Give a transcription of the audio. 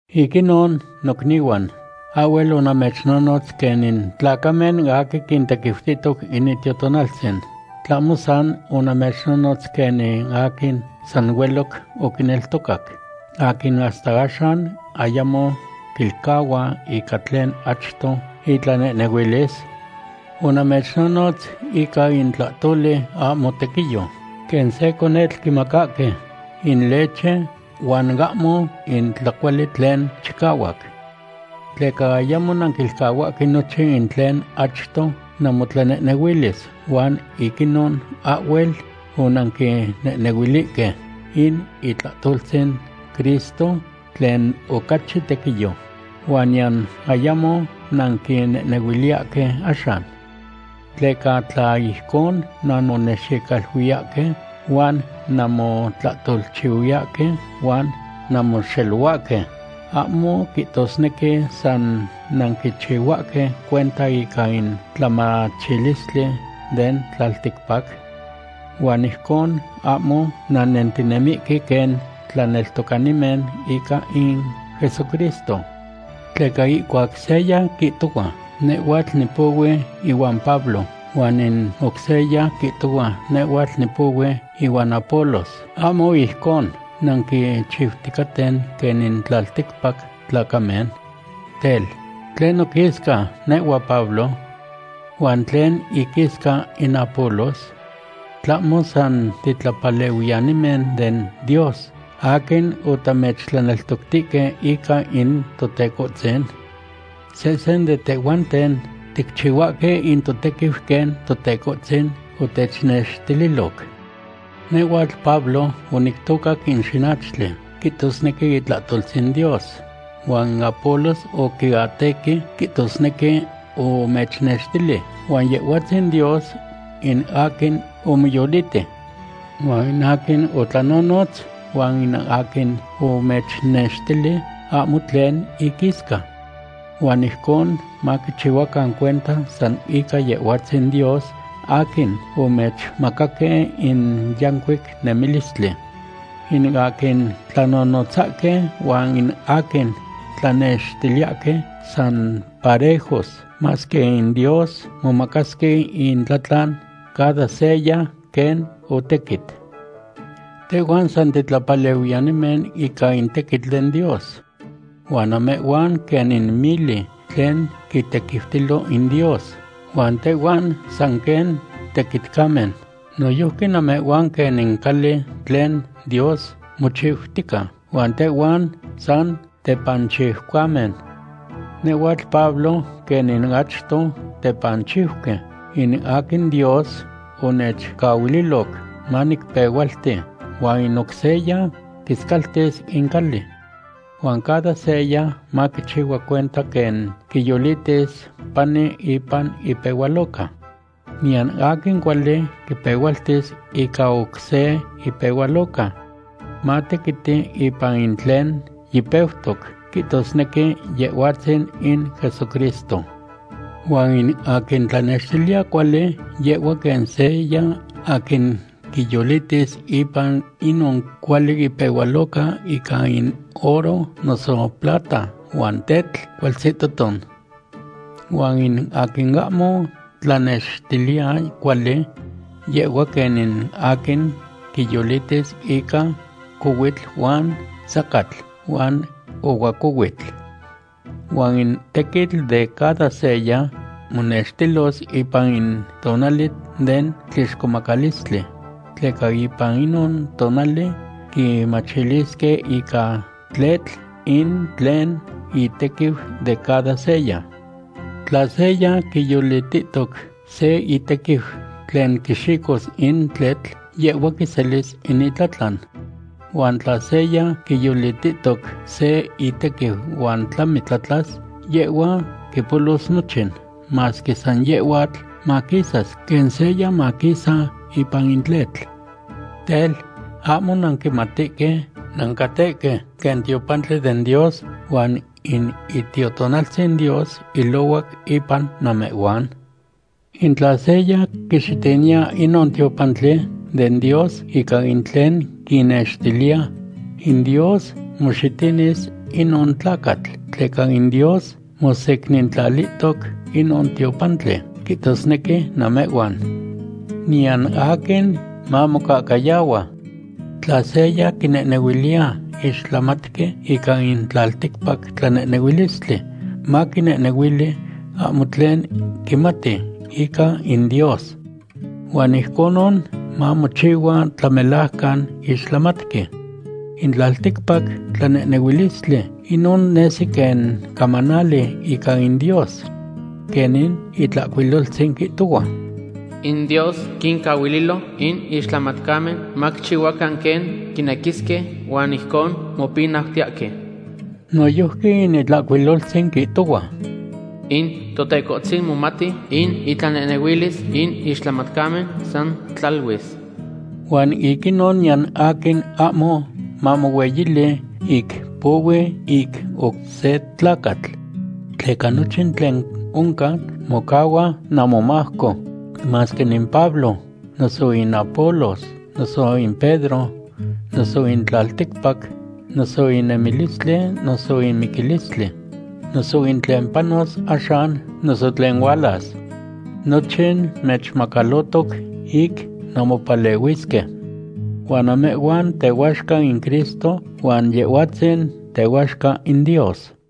Ic inon, nocnihuan, ahhuel onamechnonotz quen in tlacamen aquin quintequiutihtoc in Itiotonaltzin. ¿Tlahmo san onamechnonotz quenin aquin san hueloc oquineltocac, aquin hasta axan ayamo quilcahua ica tlen achto itlanehnehuilis? Onamechnonotz ica in tlahtoli ahmo tequiyo, quen se conetl quimacahque in leche huan ahmo in tlacuali tlen chicahuac. Tleca ayamo nanquilcahuahque nochin in tlen achto namotlanehnehuilis huan ic inon ahhuel onanquinehnehuilihque in itlahtoltzin Cristo tlen ocachi tequiyo, huan niyan ayamo nanquinehnehuiliyahque axan. Tleca tla ijcon nanmonexicaluiyahque huan nanmotlahtolchihuiyahque huan nanmoxelohuahque, ¿ahmo quihtosnequi san nanquichihuahque cuenta ica in tlamachilistli den tlalticpac? Huan ijcon ahmo nannentinemihque quen tlaneltocanimen ica in Jesucristo. Tleca ihcuac seya quihtohua: “Nehhuatl nipohui ihuan Pablo”, huan in oc seya quihtohua: “Nehhuatl nipohui ihuan Apolos”, ¿ahmo ijcon nanquichiuticaten quen in tlalticpac tlacamen? Tel, ¿tlen noquisca, nehhua Pablo? ¿Huan tlen iquisca in Apolos? ¿Tlahmo san titlapalehuiyanimen den Dios aquin otamechtlaneltoctihque ica in Totecohtzin? Sehsen de tehhuanten ticchihuahque in totequiu quen Totecohtzin otechnextililoc. Nehhuatl Pablo onictocac in xinachtli, quihtosnequi itlahtoltzin Dios, huan in Apolos oquiatequi, quihtosnequi omechyecnextili, huan Yehhuatzin Dios in aquin omoyoliti. Huan in aquin otlanonotz huan in aquin omechnextili ahmo tlen inquisca. Huan ijcon maquichihuacan cuenta san ica Yehhuatzin Dios aquin omechmacaque in yancuic nemilistli. In aquin tlanonotzahque huan in aquin tlanextiliyahque san parejos, masque in Dios momacasque intlatlan, cada seya quen otequit. Tehhuan san titlapalehuiyanimen ica in tequitl den Dios. Huan namehhuan quen in mili tlen quitequiutilo in Dios huan tehhuan san quen tequitcamen. Noyojqui namehhuan quen in cali tlen Dios mochiutica, huan tehhuan san tepanchiucamen. Nehhuatl Pablo quen in achto tepanchiuqui in aquin Dios onechcahuililoc manicpehualti, huan in oc seya quiscaltis in cali. Huan cada seya maquichihua cuenta quen quiyolitis pani ipan ipehualoca. Niyan aquin cuali quipehualtis ica oc se ipehualoca. Matequiti ipan in tlen yipeutoc, quihtosnequi Yehhuatzin in Jesucristo. Huan in aquin tlanextiliya cuali, yehhua quen seya aquin quiyolitis ipan inon cuali ipehualoca ica in oro noso plata huan tetl cualtzihtoton. Huan in aquin ahmo tlanextiliya cuali, yehhua quen in aquin quiyolitis ica cohuitl huan sacatl huan ohuacohuitl. Huan in tequitl de cada seya monextilos ipan in tonali den tlixcomacalistli, tleca ipan inon tonali quimachilisque ica tletl in tlen itequiu de cada seya. Tla seya quiyolitihtoc se itequiu tlen quixicos in tletl, yehhua quiselis in itlatlan. Huan tla seya quiyolitihtoc se itequiu huan tlami tlatlas, yehhua quipolos nochin, masque san yehhuatl maquisas quen seya maquisa ipan in tletl. Tel, ¿ahmo nanquimatihque nancatehque quen tiopantli den Dios huan in Itiotonaltzin Dios ilohuac ipan namehhuan? In tla seya quixitiniya inon tiopantli den Dios ica in tlen quinextiliya, in Dios moxitinis inon tlacatl, tleca in Dios mosecnintlalihtoc inon tiopantli, quihtosnequi namehhuan. Niyan aquin mamocahcayahua. Tla seya quinehnehuiliya ixtlamatqui ica in tlalticpac tlanehnehuilistli, maquinehnehuili ahmo tlen quimati ica in Dios. Huan ijconon mamochihua tlamelajcan ixtlamatqui. In tlalticpac tlanehnehuilistli, inon nesi quen camanali ica in Dios. Quen in Itlahcuiloltzin quihtohua: “In Dios quincahuililo in ixtlamatcamen maquichihuacan quen quinequisque huan ijcon mopinautiyahque.” Noyojqui in Itlahcuiloltzin quihtohua: “In Totecohtzin momati in itlanehnehuilis in ixtlamatcamen san tlaluis.” Huan ic inon niyan aquin ahmo mamohueyili ic pohui ic oc se tlacatl. Tleca nochin tlen oncan mocahua namomajco; masque in Pablo, noso in Apolos, noso in Pedro, noso in tlalticpac, noso in nemilistli, noso in miquilistli, noso in tlen panos axan, noso tlen hualas. Nochin mechmacalotoc ic nanmopalehuisque. Huan namehhuan tehuaxca in Cristo huan Yehhuatzin tehuaxca in Dios.